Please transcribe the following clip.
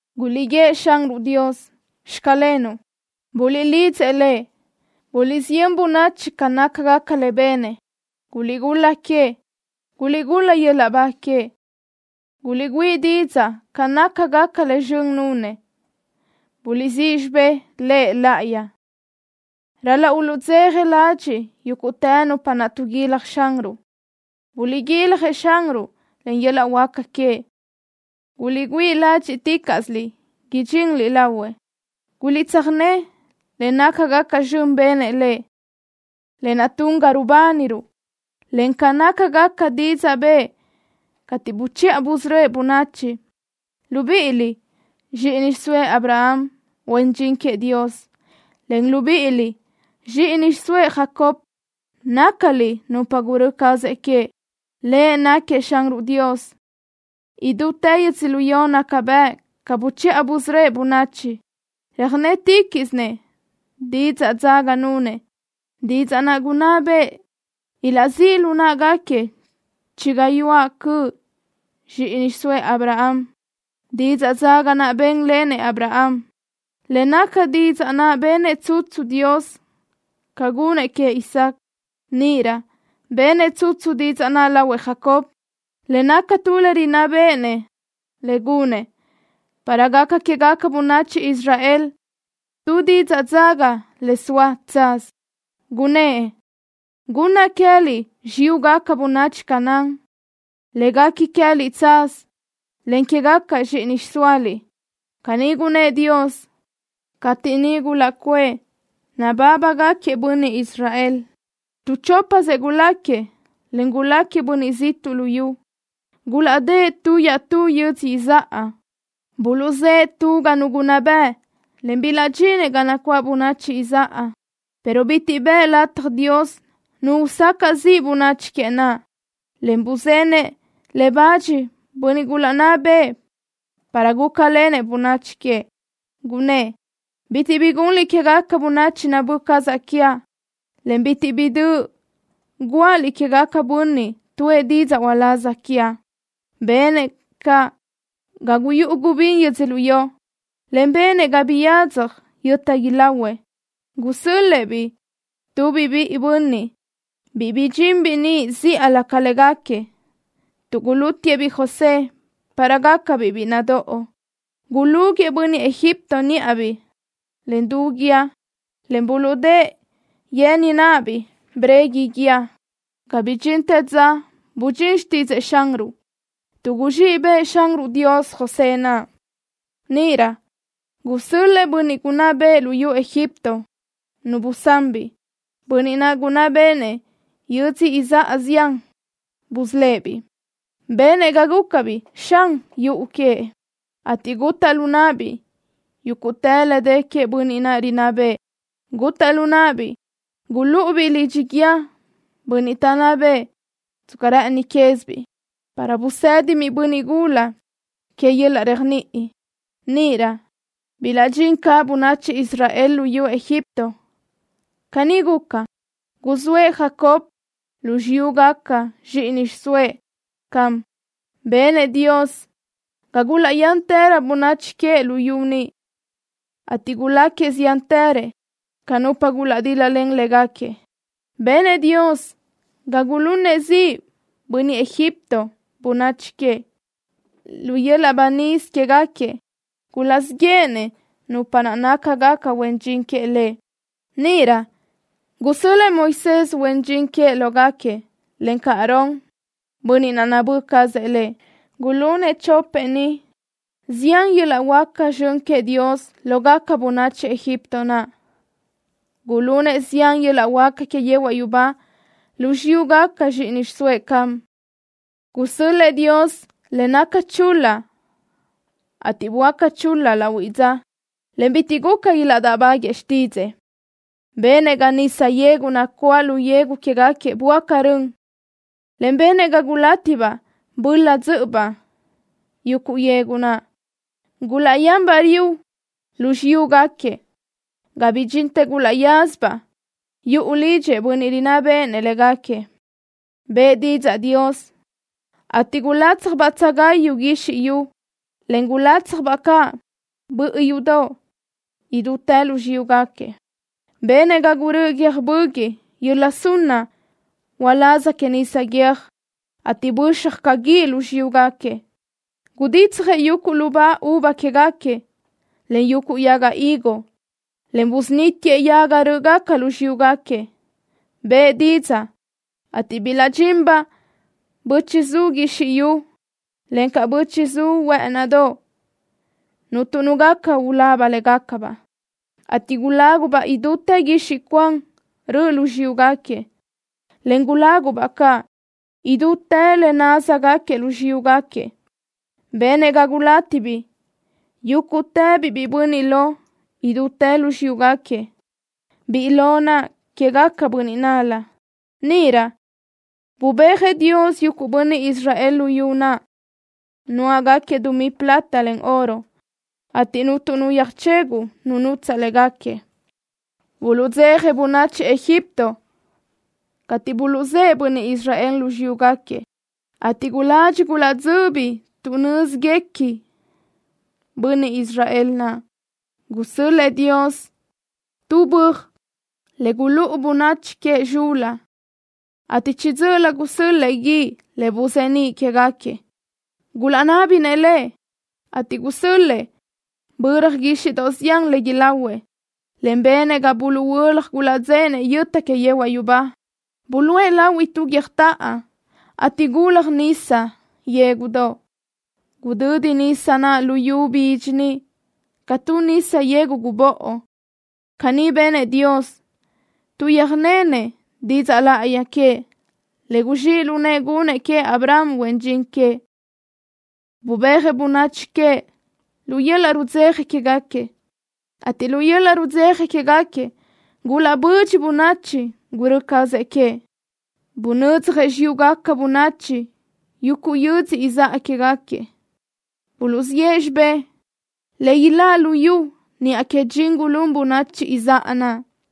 ¡Guliʼguíëʼ Xanruʼ Dios: “Xclenuʼ”! ¡Buliʼlidzëʼ Lëʼ! ¡Buliʼsiyö́n bönachi ca nácagaca le benëʼ! ¡Guliʼgul-la queëʼ! ¡Guliʼgul-la yöl-laʼ ba queëʼ! ¡Guliʼgüíʼ didzaʼ ca nácagaca le zxön nunëʼ! ¡Buliʼsíʼ xibé Lëʼ láʼayi! Ral-laʼ uluʼdzeja ladxiʼ yúguʼtë nupa taʼguilaj Xanruʼ. Guliʼguiljëʼ Xanruʼ, encaʼ yöl-laʼ huáca queëʼ. Guliʼgüíʼ ládxiʼticaʼsö idxinliʼ lahuëʼ. Guliʼtsöjné le nácagaca zxön benëʼ Lëʼ, lë naʼ tun ga rubániruʼ, encaʼ ca nácagaca didzaʼ bëʼë cateʼ buchiʼa busörö́ëʼ bönachi, libíʼiliʼ, zxíʼini xiʼsóëʼ Abraham, huen dxin queëʼ Dios, en libíʼiliʼ, zxíʼini xiʼsóëʼ Jacob, nácaliʼ nupa gurö́ cazëʼ queëʼ. Lëʼ náquiëʼ Xanruʼ Dios. Idútë yödzölió naca bëʼ ca buchiʼa busörö́ëʼ bönachi. Röjnétiquiʼsinëʼ didzaʼ dzaga nunëʼ, didzaʼ naʼ gunná bëʼë ilaʼzíʼ lu náʼagaquiëʼ chi gayuáʼ cöʼ zxíʼini xiʼsóëʼ Abraham, didzaʼ dzaga naʼ bénlenëʼ Abraham, le naca didzaʼ naʼ benëʼ tsutsu Dios ca gunëʼ queëʼ Isaac. Níʼirö benëʼ tsutsu didzaʼ naʼ lahuëʼ Jacob, le naca tu le rinná béʼenëʼ lëʼ gunëʼ, para gaca quégaca bönachi Israel tu didzaʼ dzaga le zoa tsaz. Gunnë́ʼ: “Gunnaʼ queë́liʼ xiyúgaca bönachi Canaán, le guequi tsaz queë́liʼ, en quégaca zxíʼini xiʼsóaliʼ.” Caní gunnë́ʼ Dios cateʼ niʼ gulaʼcuʼë nabábagaquiëʼ bönniʼ Israel. Tu chópasëʼ guláquiëʼ, en guláquiëʼ bönniʼ ziʼtuʼ luyú. Gulaʼdë́ʼ tu iaʼtú yödzö izáʼa. Buluʼzë́ʼë tu ga nu gunná bëʼ, en bilaʼdxínëʼ ga nacuáʼ bönachi izáʼa, pero bitiʼ bëʼë lataj Dios nu usacaʼ ziʼ bönachi queëʼ naʼ, en buzenëʼ le bach bönniʼ gulaʼnná bëʼë para gulácalenëʼ bönachi queëʼ. Gunnë́ʼ: “Bitiʼ bi gunliʼ quégaca bönachi nabö́ cazaʼ quiaʼ, en bitiʼ bi döʼ guáʼaliʼ quégaquiëʼ bönniʼ tuʼë didzaʼ uláz quiaʼ.” Benëʼ ga guyúʼu gubín yödzölió, en benëʼ ga biyadzaj yöta ilahuëʼ. Gusö́l-lëʼë tubiʼ biʼi bönniʼ, biʼi bidxinbiʼ niʼ zíʼalö ca légaquiëʼ, tuʼ gulútiʼë-biʼ José para gácabiʼ biʼi nadóʼo. Gulúguiʼë bönniʼ Egipto níʼabiʼ len du guíë, en buluʼdë́ʼë yen náʼabiʼ breguiʼ guíë, ga bidxintë dza budxín xtídzëʼë Xanruʼ, tuʼ guzxíʼ bëʼë Xanruʼ Dios José naʼ. Níʼirö gusö́l-lëʼë bönniʼ gunná bëʼë luyú Egipto nu busán-biʼ. Bönniʼ naʼ gunná béʼenëʼ yödzö izáʼa zián busölë́ʼ-biʼ. Benëʼ ga gúcabiʼ xan yuʼu queëʼ, ateʼ gutaʼ lu náʼabiʼ yúguʼtë le dë queëʼ bönniʼ naʼ rinná bëʼë. Gutaʼ lu náʼabiʼ gulúʼubiʼ lidxi guíë bönniʼ taʼnná bëʼë tsca rë́ʼëni quézibiʼ, para busédibiʼ bönniʼ gula queëʼ yöl-laʼ réajniʼi. Níʼirö bilaʼdxín caʼ bönachi Israel luyú Egipto. Caní guca, guzóëʼ Jacob lu xiyúgaca zxíʼini xiʼsóëʼ Ham. Benëʼ Dios ga gulaʼyántërö bönachi queëʼ luyú niʼ, ateʼ guláquiëʼ ziántërëʼ ca nupa gulaʼdíl-lalen légaquiëʼ. Benëʼ Dios ga gulunëʼ ziʼ bönniʼ Egipto bönachi queëʼ. Lu yöl-laʼ banís quégaquiëʼ gulaʼzíʼ yéʼenëʼ nupa naʼ nácagaca huen dxin queëʼ Lëʼ. Níʼirö gusö́l-lëʼë Moisés, huen dxin queëʼ, lógaquiëʼ, encaʼ Aarón, bönniʼ naʼ nabö́ cazëʼ Lëʼ. Gulunëʼ chopëʼ ni zián yöl-laʼ huáca zxön queëʼ Dios lógaca bönachi Egipto naʼ. Gulunëʼ zián yöl-laʼ huáca que yehuaʼ yubá lu xiyúgaca zxíʼini xiʼsóëʼ Ham. Gusö́l-lëʼë Dios le naca chul-la, ateʼ böáca chul-la lahuiʼ dza, en bitiʼ guca ilaʼdáʼbaguëʼë xtídzëʼë. Benëʼ ga nisa yegu nacuáʼ lu yegu quégaquiëʼ böáca rön, en benëʼ ga gulátibaʼ böla dzö́ʼöbaʼ yuguʼ yegu naʼ. Gulaʼyanbaʼ riu lu xiyúgaquiëʼ, ga bidxintë gulaʼyázabaʼ yuʼu lidxëʼ bönniʼ rinná béʼenëʼ légaquiëʼ. Bëʼë didzaʼ Dios, ateʼ gulátsjabaʼ bö́tsugayu guizxi yu, en gulátsjabaʼ caʼ bö́ʼiyudoʼ idútë lu xiyúgaquiëʼ. Benëʼ ga gurö́ʼö guiö́j böguiʼ yöla sunna uláz que nisa guiö́j, ateʼ böxaj caʼ guíʼ lu xiyúgaquiëʼ. Guditsjëʼ yuguʼ lubá uva quégaquiëʼ, en yuguʼ yaga higo, en busunítiëʼ yaga rö́ʼgaca lu xiyúgaquiëʼ. Bëʼë didzaʼ, ateʼ bilaʼdxinbaʼ bö́chiʼzu guizxi yu, encaʼ bö́chiʼzu huë́ʼënidoʼ, cuntu nu gaca ulaba légacabaʼ, ateʼ gulágubaʼ idútë guixiʼ cuan röʼö lu xiyúgaquiëʼ, en gulágubaʼ caʼ idútë le naz nudáʼagaquiëʼ lu xiyúgaquiëʼ. Benëʼ ga gulátibiʼ yúguʼtëbiʼ biʼi bönniʼ lo idútë lu xiyúgaquiëʼ. Biʼi lo naʼ quégaquiëʼ bönniʼ nál-la. Níʼirö bubéajëʼ Dios yuguʼ bönniʼ Israel luyú naʼ, nuáʼagaquiëʼ dumí plata, en oro, ateʼ cuntu nu yöjcheguʼ nu nutsaʼ légaquiëʼ. Buluʼdzeja bönachi Egipto cateʼ buluʼzë́ʼë bönniʼ Israel lu xiyúgaquiëʼ, ateʼ guladxi gulaʼdzöbi tuʼ nö́ziguequinëʼ bönniʼ Israel naʼ. Gusö́l-lëʼë Dios tu böaj le gulúʼu bönachi queëʼ zxul-la, ateʼ chiʼi dzö́ʼölö gusö́l-lëʼë guíʼ le buzeníʼ quégaquiëʼ. Gulaʼnábinëʼ Lëʼ, ateʼ gusö́l-lëʼë böra guíxiʼdoʼ zián le ilahuëʼ, en benëʼ ga buluʼhuö́laj gulaʼdzéʼenëʼ yöta que yehuaʼ yubá. Buluʼë lahui tu guiö́jtoʼo, ateʼ gulalaj nisa yégudoʼ. Gudödi nisa naʼ luyú bidxi niʼ ca tu nisa yegu gubóʼo. Caní benëʼ Dios tuʼ yöjnenëʼ didzaʼ láʼayi queëʼ, le guzxíʼ lu nëʼë gunëʼ queëʼ Abraham, huen dxin queëʼ. Bubéajëʼ bönachi queëʼ lu yöl-laʼ rudzeja quéguequi, ateʼ lu yöl-laʼ rudzeja quéguequi gulaʼbö́dxiʼa bönachi gurö́ cazëʼ queëʼ. Bunödzjëʼ xiyúgaca bönachi yuguʼ yödzö izáʼa quégaquiëʼ. Buluʼziʼë xibé le iláʼ luyú niʼa que dxin gulún bönachi izáʼa naʼ.